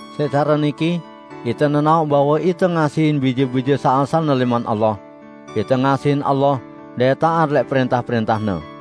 Siq care niki ite nenaoq bahwe ite ngasihin bije-bije saq asalne lẽman Allah: Ite ngasihin Allah dait taat lẽq prẽntah-prẽntah-Ne.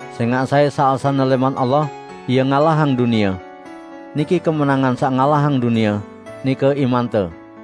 sẽngaq sai saq asalne lẽman Allah, ie ngalahang dunie. Niki kemenangan saq ngalahang dunie, nike imante.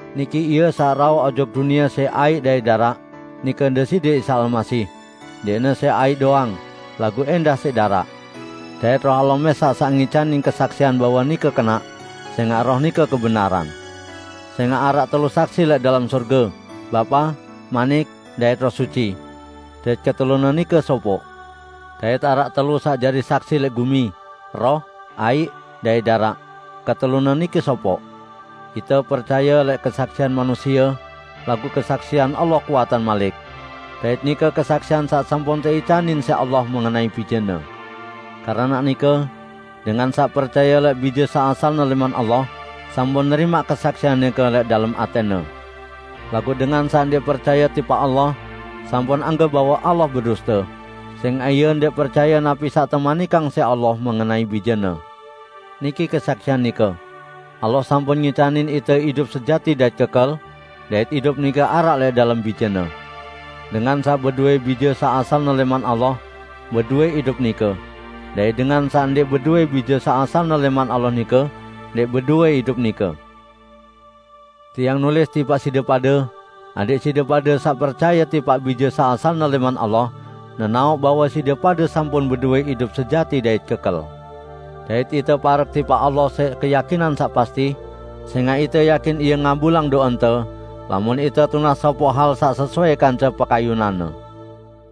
Niki Ie saq rauh ojok dunie siq aiq dait daraq, nike Deside Isa Almasih; ndẽqne siq aiq doang, laguq ẽndah siq daraq. Dait Roh Allah mẽsaq saq ngicanin kesaksian bahwe nike kenaq, sẽngaq Roh nike kebenaran. Sẽngaq araq telu saksi lẽq dalem sorge: Bapa, Manik dait Roh Suci; dait ketelune nike sopoq. Dait araq telu saq jari saksi lẽq gumi: Roh, aiq dait daraq, ketelune nike sopoq. Ite percaye lẽq kesaksian manusie, laguq kesaksian Allah kuatan malik. Dait nike kesaksian saq sampun teicanin siq Allah mengenai Bije-Ne. Keranaq nike, dengan saq percaye lẽq Bije saq asalne lẽman Allah, sampun nerimaq kesaksian nike lẽq dalem atẽne; laguq dengan saq ndẽq percaye tipaq Allah, sampun anggep bahwe Allah beduste, sẽngaq ie ndẽq percaye napi saq temanikang siq Allah mengenai Bije-Ne. Niki kesaksian nike: Allah sampun ngicanin ite idup sejati dait kekel, dait idup nike araq lẽq dalem Bije-Ne. Dengan saq bedowẽ Bije saq asalne lẽman Allah, bedowẽ idup nike; dait dengan saq ndẽq bedowẽ Bije saq asalne lẽman Allah nike, ndẽq bedowẽ idup nike. Tiang nulis tipaq side pade, adẽq side pade saq percaye tipaq Bije saq asalne lẽman Allah, nenaoq bahwe side pade sampun bedowẽ idup sejati dait kekel. Dait ite parek tipaq Allah siq keyakinan saq pasti, sẽngaq ite yakin Ie ngabulang do'ente, lamun ite tunas sopoq hal saq sesuai kance pekayunan-Ne.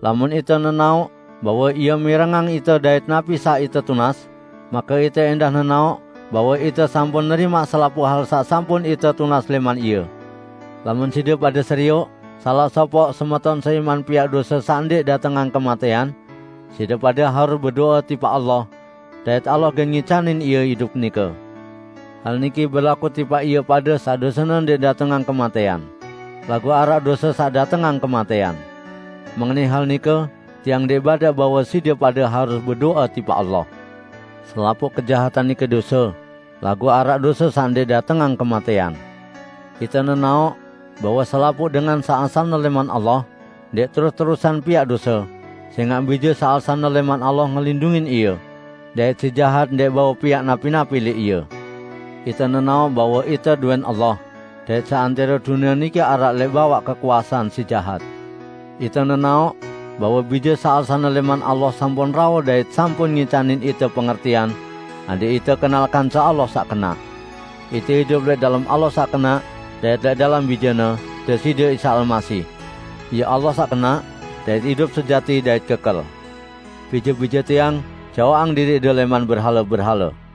Lamun ite nenaoq bahwe Ie mirengang ite dait napi saq ite tunas, make ite ẽndah nenaoq bahwe ite sampun nerimaq selapuq hal saq sampun ite tunas lẽman Ie. Lamun side pade serioq salaq sopoq semeton seiman piaq dose saq ndẽq datengang kematẽan, side pade harus bedo'e tipaq Allah; dait Allah gen ngicanin ie idup nike. Hal niki berlaku tipaq ie pade saq dosene ndẽq datengang kematẽan. Laguq araq dose saq datengang kematẽan. Mengenai hal nike tiang ndẽq badaq bahwe side pade harus bedo'e tipaq Allah. Selapuq kejahatan nike dose, laguq araq dose saq ndẽq datengang kematẽan. Ite nenaoq bahwe selapuq dengan saq asalne lẽman Allah, ndẽq terus-terusan piaq dose, sẽngaq Bije saq asalne lẽman Allah ngelindungin ie, dait Si Jahat ndẽq bau piaq napi-napi lẽq ie. Ite nenaoq bahwe ite dowẽn Allah, dait seantẽro dunie niki araq lẽq bawaq kekuasean Si Jahat. Ite nenaoq bahwe Bije saq asalne lẽman Allah sampun rauh dait sampun ngicanin ite pengertian, adẽq ite kenal kance Allah saq kenaq. Ite idup lẽq dalem Allah saq kenaq dait lẽq dalem Bije-Ne, Deside Isa Almasih. Ie Allah saq kenaq, dait idup sejati dait kekel. Bije-bije tiang, jaoqang diriqde lẽman berhale-berhale!